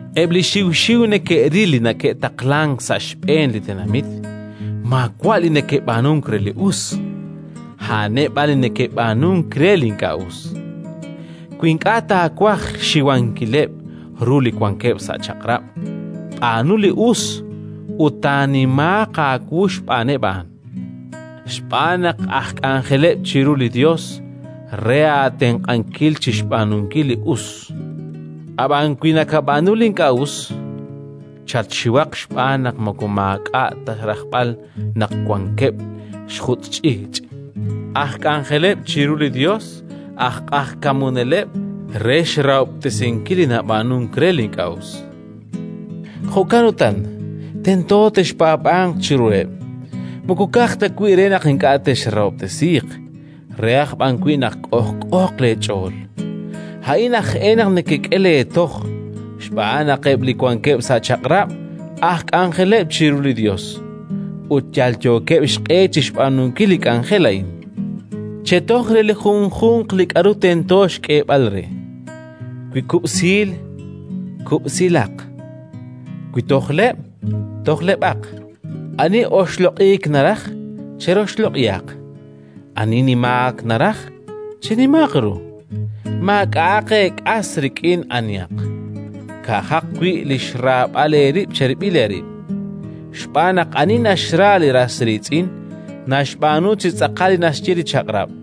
Eb' li xiw xiw neke'ril li neke'taqlank sa' xb'een li tenamit maawa' li neke'b'aanunk re li us, a'aneb' b'an li neke'b'aanunk re li ink'a' us. Wi ink'a' taawaj xxiwankileb' ru li wankeb' sa' chaq'rab', b'aanu li us ut taanimaaq aawu xb'aaneb' a'an, xb'aan naq aj k'anjeleb' chiru li Yos re aatenq'ankil chi xb'aanunkil li us. Ab'an wi nakab'aanu li ink'a' us, chatxiwaq xb'aan naq moko maak'a' ta rajb'al naq wankeb' xjutz' ch'iich': aj k'anjeleb' chiru li Yos, aj q'ajkamuneleb' re xrahob'tesinkil li nab'aanunk re li ink'a' us. Jo'kan utan, tento texpaab'anq chiruheb', moko ka'aj ta wi' re naq ink'a' texrahob'tesiiq, re aj b'an wi' naq k'ojk'ooq leech'ool. A'in aj e naq nekek'e leetoj, xb'aan naq eb' li wankeb' sa' chaq'rab' aj k'anjeleb' chiru li Yos, ut yalyookeb' xq'e chi xb'aanunkil li k'anjel a'in. Chetoj re li junjunq li k'aru tento xk'eeb'al re: wi kub'siil, kub'siilaq; wi tojleb', tojleb'aq; ani oxloq'iik naraj, cheroxloq'ihaq; ani nimaak naraj, chenimaaq ru. Li rahok ut li Chaq'rab' Maak'a'aq eek'as rik'in anihaq, ka'ajaq wi' li xraab'al eerib' cherib'il eerib'. Xb'aan naq ani naxra li ras riitz'in naxb'aanu chi tz'aqal li naxye li Chaq'rab'.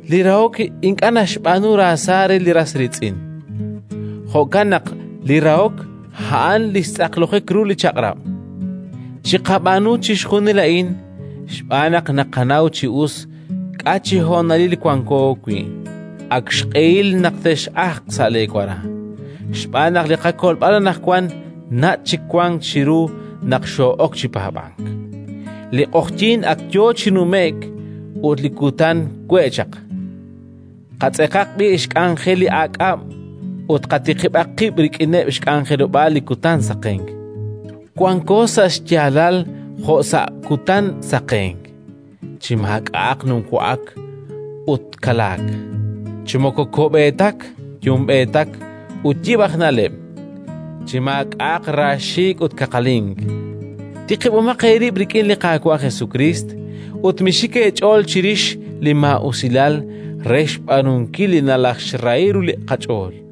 Li rahok ink'a' naxb'aanu raasa re li ras riitz'in. Jo'kan naq li rahok a'an li xtz'aqlojik ru li Chaq'rab'. Chiqab'aanu chixjunil a'in xb'aan naq naqanaw chi us k'a' chi honalil wanko wi': ak xq'ehil naq tex'ajq sa' leewara xb'aan naq li qakolb'al anaqwan nach' chik wank chiru naq xoo'ok chi paab'ank. Li q'oqyink ak yo chi nume'k ut li kutan we' chaq. Qatz'eqaq b'i' xk'anjel li aak'ab' ut qatiqib'aq qib' rik'ineb' xk'anjelob'aal li kutan saqenk. Wanqo sa' xyaalal jo' sa' kutan saqenk, chi maak'a'aq numwa'ak ut kalaak, chi moko ko'b'eetak yumb'eetak ut yib' aj na'leb', chi maak'a'aq raaxiik' ut kaqalink. Tiqib'omaq eerib' rik'in li Qaawa' Jesukriist, ut mixik eech'ool chirix li maa'usilal re xb'aanunkil li nalajxrahi ru li qach'ool.